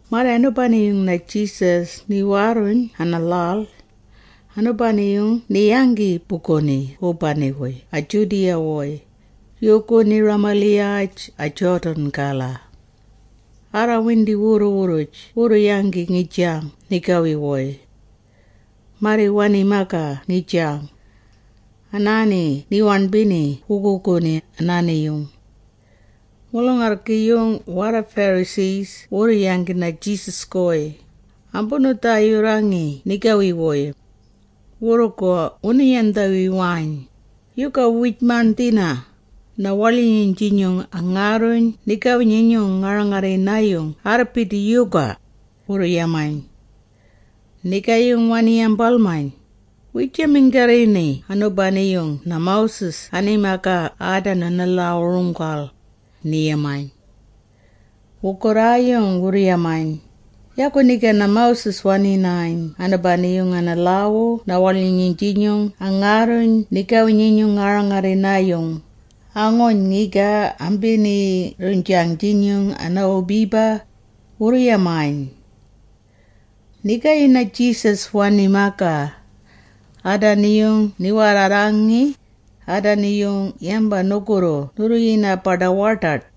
Marri anubani-yung na-Jesus niwaarruyn ana-lhal, anubani-yung ni-yanggi buguni wubani-wuy a-Judea-wuy, yuuguni ramaliyaj a-Jordan aala. Arraarrawindi wurru-wurruj wurru-yanggi ngijang nigawi-wuy. Marri wani-magaa ngijang. Anaani ni-waṉbini wuguuguni anaani-yung. Mulung-arrgi-yung warra-Pharisee wurru-yanggi na-Jesus-guy, ambunu-dhaayurrangi nigawi-wuy. Wugurru wunu-yandhawiwayn, “Yuga wiij-maṉdhina, na-waḻyinyung-jinyung angaarruyn nigawi-nyinyung ngarra-rangarrina-yung anaarrbidi yuga?” wurru-yamayn. Nigaayung wani-yambalmayn, “Wiijaminggarrini anubani-yung na-Moses nani-magaa aadanu ana-lhaawu-runggal?” ni-yamayn. Wugurraayung wurru-yamayn, “Yagu niga na-Moses wani-yayn anubani-yung ana-lhaawu na-waḻyinyung-jinyung angaarruyn nigawi-nyinyung ngarra-rangarrina-yung, anguuyn ngiga ambiniirruynjang-jinyung ana-wubiba.” wurru-yamayn. Nigaayung na-Jesus wani-magaa, “Aadani-yung ni-warrarrangi, aadani-yung yamba nugurru nurru-yinag-baḏa-waḏaḏ.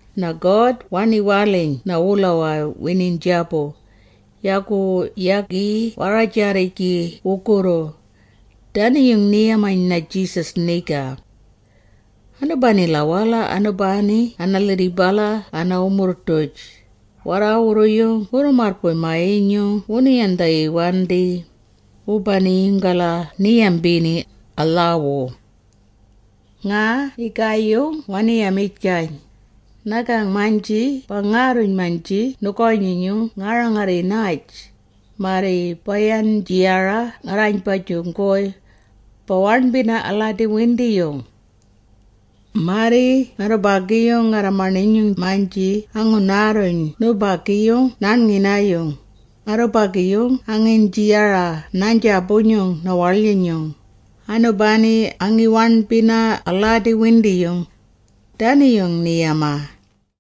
na-God wani-waliyn na-wulawaa winiiynjaabu, yagu yagi warra-rajaarrijgi wugurru.” Dani-yung ni-yamayn na-Jesus niga. Anubanila-wala, anubagu ana-lhirribala ana-wumurrng-duj, warraawurru-yung wurru-marrbuy-maa-yinyung wunu-yandhawiwandi, wubani-yung-gala ni-yambini, a-lhaawu. Nga nigaayung wani-yamijgayn, “Nagang-maynji bangaarruyn-maynji nugawi-nyinyung nga-rangarrinaaj, marri baaynji-yara ngarraaynbajung-guy, ba-waṉbina aladi-windiyung. Marri ngarrubagi ngarra-maṉinyung-maynji angunaarruyn nubagi-yung naaṉngina-yung, ngarrubagi-yung angiiyni-yara naaynbajung na-waḻyinyung, anubani angi-waṉbina aladi-windiyung.” Dani-yung ni-yamaa.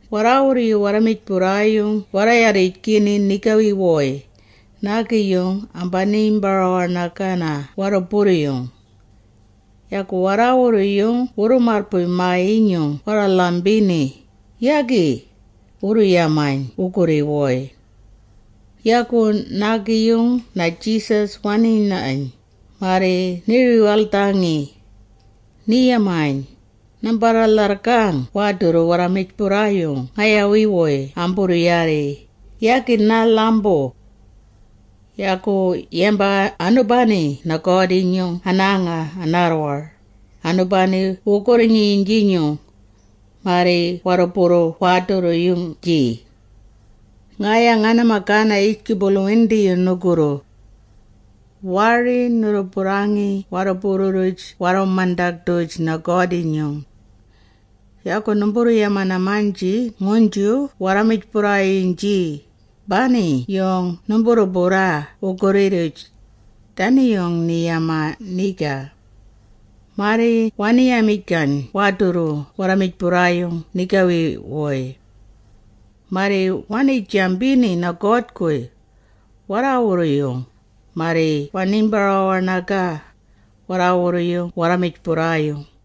Warraawurru-yung mijburrayung warra-yarrijgini nigawi-wuy, naagi-yung ambiniimbara-waṉagaa warruburru-yung. Yagu warraawurru-yung wurru-marrbuy-maa-yinyung warra-lhambini, “Yagi!” wurru-yamayn wugurri-wuy. Yagu nigaayung na-Jesus wani-nayn, marri ni-riyaldhangi. Ni-yamayn, “Nambarra-lharrgang waadurru warra-mijburrayung ngayawi-wuy amburru-yaarri, yagi narra-lhambu. Yagu yamba anubani na-God-jinyung anaanga anaarrwar, anubani wugurri-nyinyung, marri warruburru waadurru-yung-jii. “Ngaya ngana-magana yijgubulu-windiyung nugurru. Waari nurru-burrangi warruburru-rruj warru-mandag-duj na-God-jinyung. Yagu numburru-yamana-maynji nguynju warra-mijburrayung-jii, bani-yung numburru-burraa wugurri-rruj.” Dani-yung ni-yamaa niga. Marri wani-miyn waadurru-yung warra-mijburrayung nigawi-wuy. Marri wanii-jambini na-God-guy, warraawurru-yung, marri waniimbara-waṉagaa, warraawurru-yung warra-mijburrayung.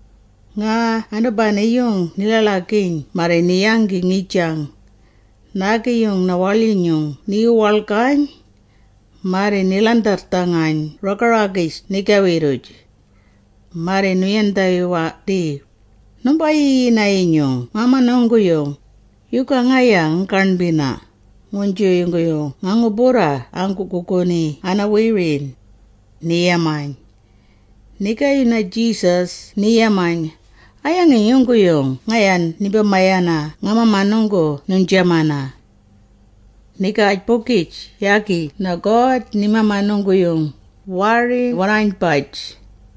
Nga anubani-yung ni-ḻaḻagiiyn marri ni-yanggi ngijang. Naagi-yung waḻyinyung ni-wuwaḻgayn. Marri ni-ḻandharrdhangayn raga-ragij nigawi-rruj. Marri nu-yandhawawandi, “Numba-yiyina-yinyung mamanunggu-yung, yuga ngaya nganggaṉbina, nguynju yungguyung nga-ngu-burraa anggu-wuguuguni ana-wiri?” ni-yamayn. Nigaayung na-Jesus ni-yamayn, “A-yangi yungguyung ngaya nimba-mayana nga-mamanunggu nuynjamana? Nigaaj-bugij yaagi God na-mamanunggu-yung, waari warraaynbaj.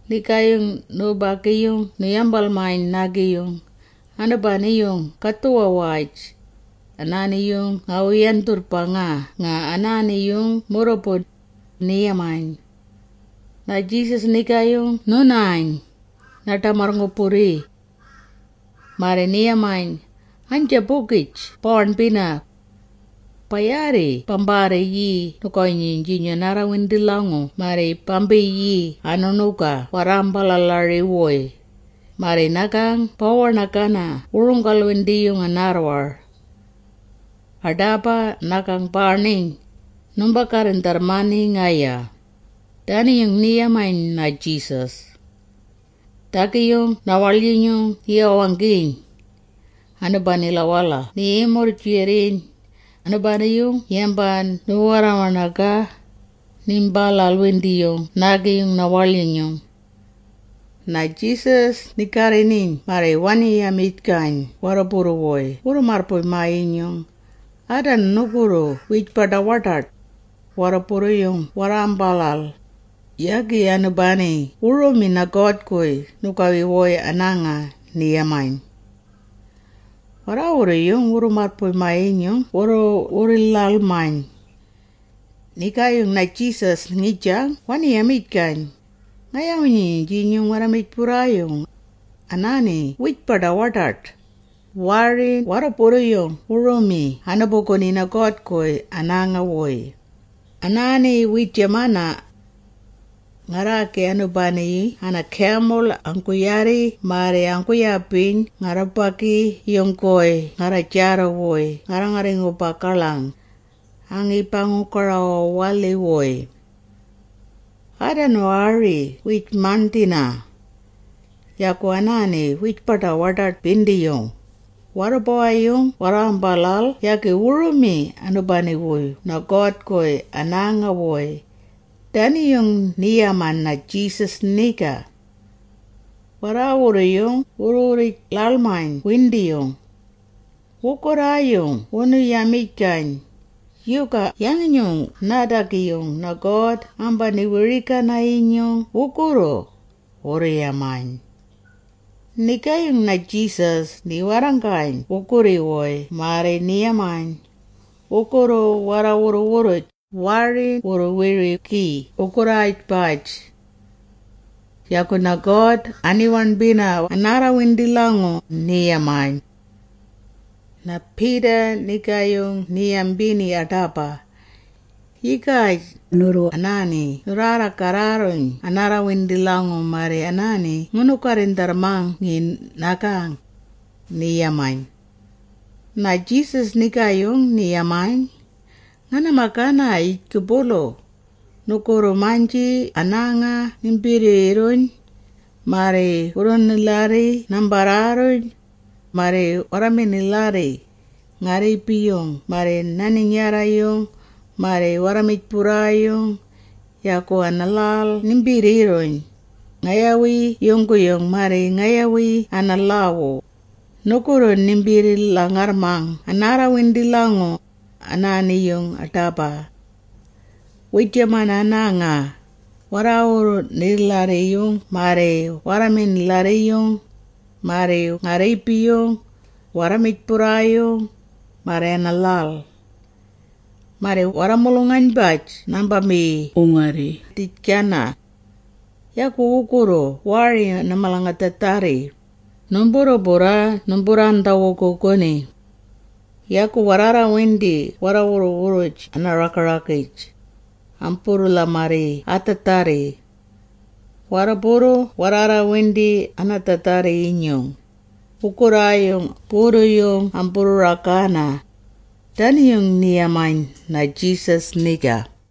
Nigaayung nubagi-yung nu-yambalmayn nigaayung, “Anubani-yung nga-gadhuwa-waj, anaani-yung ngawu-yandhurrbangaa nga anaani-yung murrubu,” ni-yamayn. Na-Jesus nigaayung nu-nayn, naa-ḏamarr-ngu-burri. Marri ni-yamayn, “Aynjaabugij baaṉbina. Ba-yaarri bambarriiyii nugawi-nyinyung anaarrawindi-lhangu marri bambiiyii anu-ṉuga warraambalalari-wuy, marri nagang bawu-waṉagana runggal-windiyung anaarrwar. Aḏaba nagang baaṉiyn, numba-garrindharrmani ngaya.” Dani-yung ni-yamayn na-Jesus. Naadagi-yung na-waḻyinyung ni-wawanggiyn. Anubanila-wala ni-yimurr-jiwuriyn, anaani-yung yamba ni-warra-waṉagaa, niimbalal-windiyung naagi-yung na-waḻyinyung. Na-Jesus ni-garri-niiyn marri wani-yamijgayn warruburru-wuy wurru-marrbuy-maa-yinyung, “Aadanu wugurru wiij-baḏa-waḏaḏ, warrubawi-yung warraambalal, yagi anubani wu-rumi na-God-guy nigawi-wuy anaanga.” ni-yamayn. Warraawurru-yung wurru-marrbuy-maa-yinyung wurru-wurri-ḻaḻmayn. Nigaayung na-Jesus ngijang wani-yamijgayn, “Ngayawi-nyinyung mijburrayung, anaani wiij-baḏa-waḏaḏ, waari warrubawa-yung wu-rumi anubuguni na-God-guy anaanga-wuy. Anaani wiijamana. Ari anubani ana-gamul anggu-yaarri marri anggu-yabiyn ngarrubagi-yung-guy ngarra-jaarru-wuy ngarra-ngarri-ngu-bagaḻang, ngi-ba-ngu-gara-wawalhii-wuy. Aadanu ari wiij-maṉdhina! Yagu anaani wiij-baḏa-waḏaḏ-bindiyung, warrubawi-yung warraambalal yagi wu-rumi anubani-yung na-God-guy anaanga-wuy.” Dani-yung ni-yamaa na-Jesus niga. Warraawurru-yung wurru-wurri-ḻaḻmayn windiyung. Wugurraayung wunu-yamijgayn, “Yuga yangi-nyung naadagi na-God ambani-wiri-gana-yinyung wugurru?” wurru-yamayn. Nigaayung na-Jesus ni-warranggayn wugurri-wuy marri ni-yamayn, “Wugurru warra-wurru-wurruj waari wurru-wiri-gi wugurraajbaj. Yagu na-God ani-waṉbina anaarrawindi-lhangu,” ni-yamayn. Na-Peter nigaayung ni-yambini aḏaba. “Yigaj, nurru anaani nurraarra-garraarruyn anaarrawindi-lhangu, marri anaani ngunu-garrindharrmangi nagang,” ni-yamayn. Na-Jesus nigaayung ni-yamayn, “Ngana-magana yijgubulu, nugurru-maynji anaanga nimbirriirruyn, marri warru-nilharri nambarraarruyn, marri warru-ngarrilharri, nga-rriibi-yung marri na-ninyarra-yung, marri warra-mijburrayung, yagu ana-lhal nimbirriirruyn, ngayawi yungguyung, marri ngayawi ana-lhaawu, nugurru nimbirri-lhangarrmang anaarrawindi-lhangu, anaani-yung aḏaba. Wiijamana, anaanga, warru-nilharri-yung marri warru-ngarrilharri-yung, marri nga-rriibi-yung, warra-mijburrayung, marri ana-lhal. Marri warra-mulung-aynbaj nambambi-wungarri-dhijgana. Yagu wurrugu marri malgadhaadharri, numburru-burraa numburraandha-wuguuguni. Yagu warraarrawindi warra-wurru-wurruj ana-raga-ragij, amburru-lhamarrii adhaadharri. Warruburru warraarraarrawindi anaadhaadharri-yinyung, wugurraayung burru-yung amburru-ragaana.” Dani-yung ni-yamaa na-Jesus niga.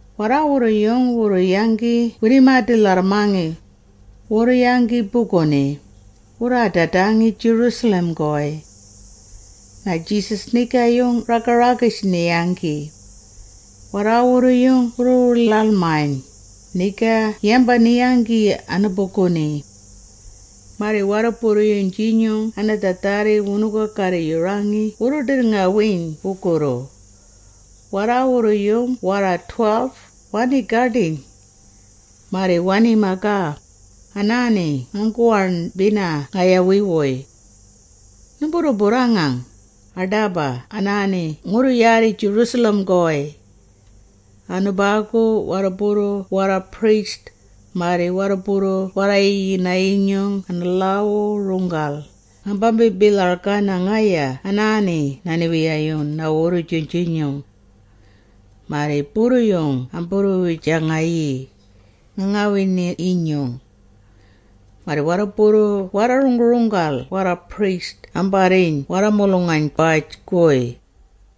Warraawurru-yung wurru-yanggi wirrimaadi-lharrmangi, wurru-yanggi buguni, wurraadadangi Jerusalem-guy. Na-Jesus nigaayung a-raga-ragij ni-yanggi. Warraawurru-yung wurru-wurri-ḻaḻmayn, niga yamba ni-yanggi anubuguni. Marri warruburru-yung-jinyung anaadhaadharri wunu-ga-garri-yurangi wurru-ḏirrngawiiyn wugurru. Warraawurru-yung warra-12, wanii-gaḏiyn. Marri wani-magaa, “Anaani anggu-waṉbina ngayawi-wuy. Numburraarranggang, aḏaba anaani ngurru-yaarri Jerusalem-guy. Anubagu warruburru warra-priest, marri warruburru warra-yiyina-yinyung ana-lhaawu-runggal, ngambambi-bilhargana ngaya anaani na-Niwiyayung na-Wurrujung-jinyung. Marri burru-yung amburru-wijangayii, nga-ngawiiyn-jinyung. Marri warruburru-yung warra-runggu-runggal warra-priest ambarriiyn warra-mulung-aynbaj-guy,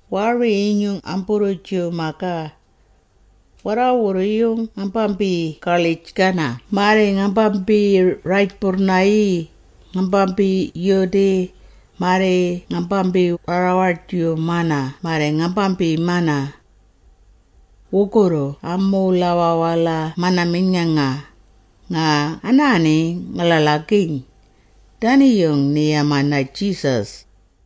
waari-yinyung amburru-Jew-magaa. Warraawurru-yung ngambambi-gaḻij-gana marri ngambambi-rajburrnayii, ngambambi-yudii, marri ngambambi-warra-waḏjiwumana marri ngambambiimana. Wurrugu amuulawaa-wala mana-miyn.nganga, ngaya anaani nga-ḻaḻagiiyn.” Dani-yung ni-yamaa na-Jesus.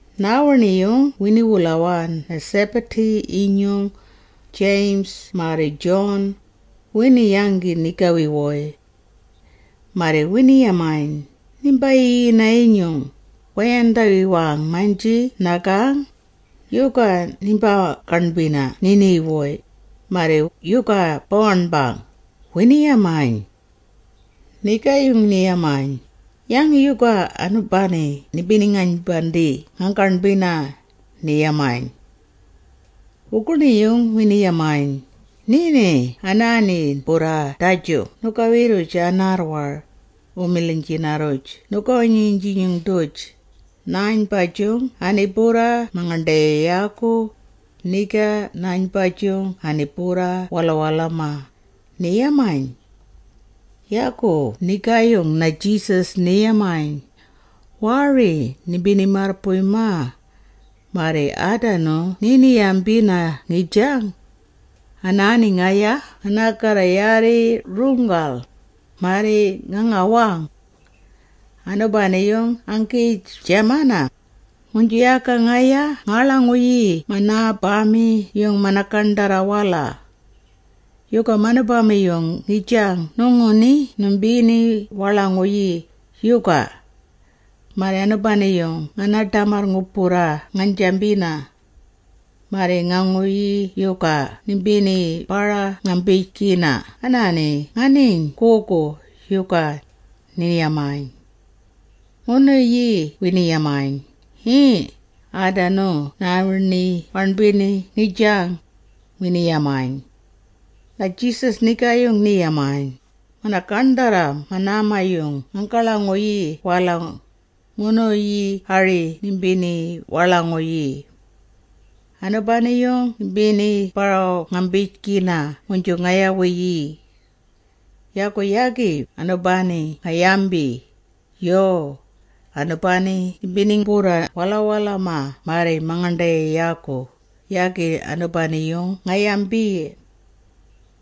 Naawiṉi-yung wini-wulawaa na-Zebedee-yinyung, James marri John, wini-yanggi nigawi-wuy. Marri wini-yamayn, “Nimba-yiyina-yinyung, wa-yandhawiwang-maynji nagang, yuga nimbaa-gaṉbina niiṉi-wuy, marri yuga baaṉbang?” wini-yamayn. Nigaayung ni-yamayn, “Yangi yuga anubani nimba-ngaynbandii anambaa-gaṉbina?” ni-yamayn. Wuguṉiiyung wini-yamayn, “Niiṉi naani-burraa daju nugawi-rruj anaarrwar, wu-milhiynjina-rruj nugawi-nyinyung-duj, naaynbajung ani-burraa mangaṉḏayayaagu, niga naaynbajung ani-burraa walawalama,” wini-yamayn. Yagu nigaayung na-Jesus ni-yamayn, “Waari nimbini-marrbuy-magaa, marri aadanu niini-yambina ngijang. Anaani ngaya nganggarragayii runggal, marri nga-ngawang. Anubani-yung anggiijamana, nguynju yaga ngaya nganggaḻ-nguyii manubama-yung mana-gaṉdharra-wala. Yuga manubama-yung ngijang nuguṉi nimbini-waḻ-nguyii, yuga? Marri anubani-yung ngandaambara-ngambijgina. Marri nuguṉiiyung yuga nimbiniimbara-ngambijgina anaani anggiiyn-nguynju, yuga?” ni-yamayn. Wuguṉiiyung wini-yamayn, “Yii, aadanu naani-waṉbina ngijang,” wini-yamayn. Na-Jesus nigaayung ni-yamayn, “Mana-gaṉdharra manubama-yung nganggaḻ-nguyii-wala, nuguṉiiyung ari nimbini-waḻ-nguyii. Anubani-yung nimbiniimbara-ngambijgina nguynju ngayawi-yii. Yagu yagi anubani-yung nga-yambi, ‘Yuu, anubani nimbini-burraa walawalama marri mangaṉḏayayaagu’, yagi anubani-yung nga-yambi.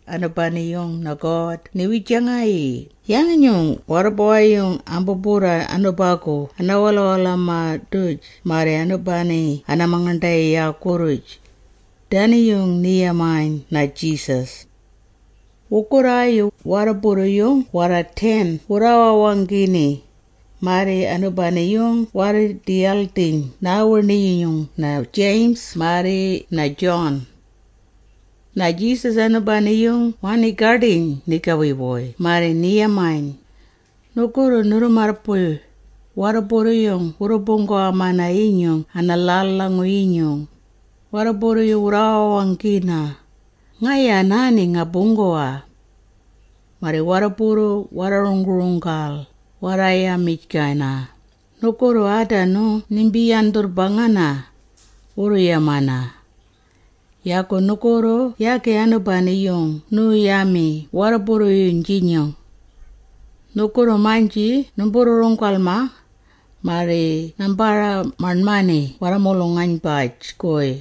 Anubani-yung God ni-wijangani, yangi-nyung warrubawi-yung ambu-burraa anubagu ana-walawalamag-duj marri anubani ana-mangaṉḏayayaagu-rruj.” Dani-yung ni-yamayn na-Jesus. Wugurraayung warruburru-yung warra-10 wurraawanggini, marri anubani-yung warraa-ḏiyaldhiyn naawiṉi-yung na-James marri na-John. Na-Jesus anubani wanii-gaḏiyn nigawi-wuy marri ni-yamayn, “Nugurru nurru-marrbuy, warruburru-yung wurru-buunggawa-mana-yinyung ana-lhal-lhangu-yinyung, warruburru-yung wurraawanggina, ‘Ngaya anaani nga-buunggawa.’ Marri warruburru waa-runggu-runggal, warra-yamijgana, ‘Nugurru aadanu nimba-yandhurrbangana,’ wurru-yamana. Yagu nugurru yagi anubani-yung nuu-yami warruburru-yung-jii. Nugurru-maynji numburru-runggal-mang, marri nambarra-maṉmani warra-mulung-aynbaj-guy.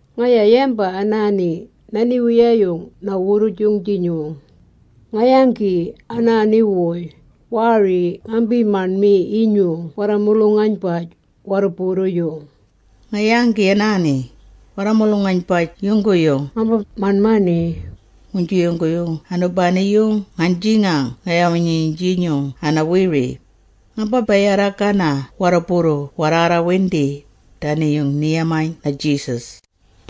Ngaya yamba anaani, na-Niwiyayung na-Wurrujung-jinyung, nga-yanggi anaanuwuy, waari ngambi-maṉmi-yinyung warra-mulung-aynbaj warruburru-yung. Nga-yanggi anaani, warra-mulung-aynbaj yungguyung ngamba-maṉmani, nguynju yungguyung anubani-yung ngaynjiynjang ngayawi-nyinyung ana-wiri, ngamba-bayarra-gana warruburru-yung warraarraarrawindi.” Dani-yung ni-yamaa na-Jesus.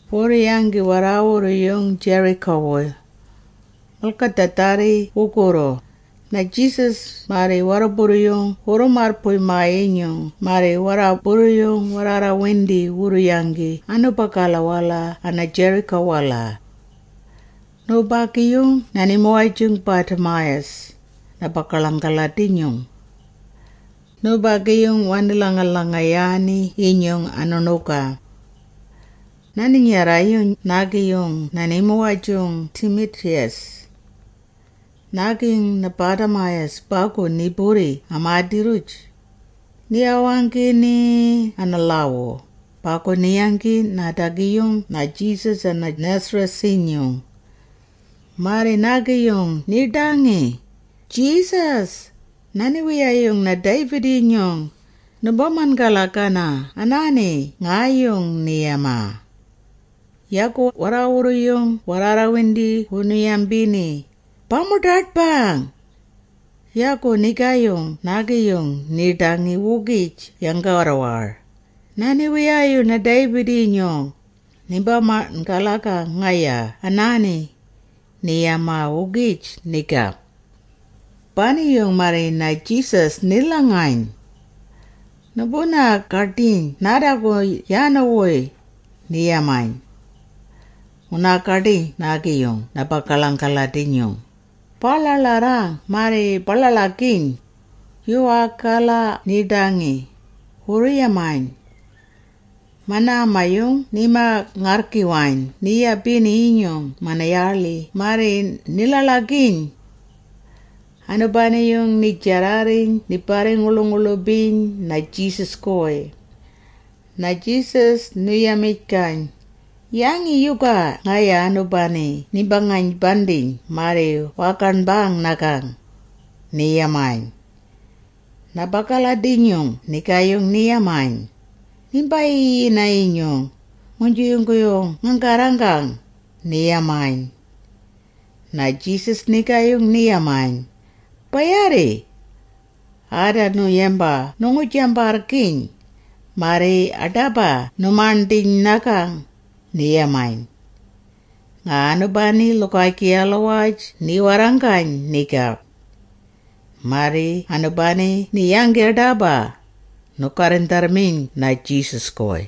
Wurru-yanggi warraawurru-yung Jericho-wuy. Malgadhaadharri wurrugu, na-Jesus marri warruburru wurru-marrbuy-maa-yinyung marri warruburru warraarraarrawindi wurru-yanggi anubagala ana-Jericho-wala. Nubagi-yung na-nimuwaj-jung Bartimaeus, na-bagaḻang-aladi-nyung. Nubagi-yung wani-lhanga-lhangayaani-yinyung wuṉuga. Na-ninyarra-yung naagi-yung na-nimuwaj-jung Timaeus. Naagi na-Bartimaeus bagu ni-burri amaadi-rruj. Ni-wawanggiyn ana-lhaawu, “Bagu ni-yanggi naadagi-yung na-Jesus ana-Nazareth-jinyung.” Marri naagi-yung niiḏangi, “Jesus, na-niwiyayung na-David-jinyung, nimba-man.galagang anaani ngaayung!” ni-yamaa. Yagu warraawurru-yung arraarrawindi wunu-yambini, “Ba-muḏaḏbang!” Yagu nigaayung naagi-yung niiḏangi-wugij yanggarrwar, “Na-niwiyayung na-David-jinyung, nimba-man.galagang ngaya anaani!” ni-yamaa-wugij niga. Bani-yung marri na-Jesus ni-lhangayn. “Numbunaa-gaḏiyn naadagu yaanuwuy,” ni-yamayn. Wunaa-gaḏangi naagi-yung na-bagaḻang-aladi-nyung, “Baaḻaaḻarrang marri ba-ḻaḻagiiyn, yuwaagila ninii-gaḏii,” wurru-yamayn. Manaama-yung nima-ngarrgiwayn ni-yabini-yinyung mana-yaaḻi marri ni-ḻaḻagiiyn. Anubani-yung ni-jarrarriyn ni-barri-nguḻu-nguḻubiyn na-Jesus-guy. Na-Jesus nu-yamijgayn, “Yangi yuga ngaya anubani nimba-ngaynbandiyn marri waa-gaṉbang nagang?” ni-yamayn. Na-bagaḻang-aladi-nyung nigaayung ni-yamayn, “Nimba-yiyina-yinyung, nguynju yungguyung nganggarranggang,” ni-yamayn. Na-Jesus nigaayung ni-yamayn, “Ba-yaarri. Aadanu yamba nu-ngu-jambarrgiiyn, marri aḏaba nu-maṉdhiiyn nagang,” ni-yamayn. Nga anubani lhugaajgiyalawaj ni-warranggayn niga. Marri anubani ni-yanggi aḏaba, nu-garrindharrmiyn na-Jesus-guy.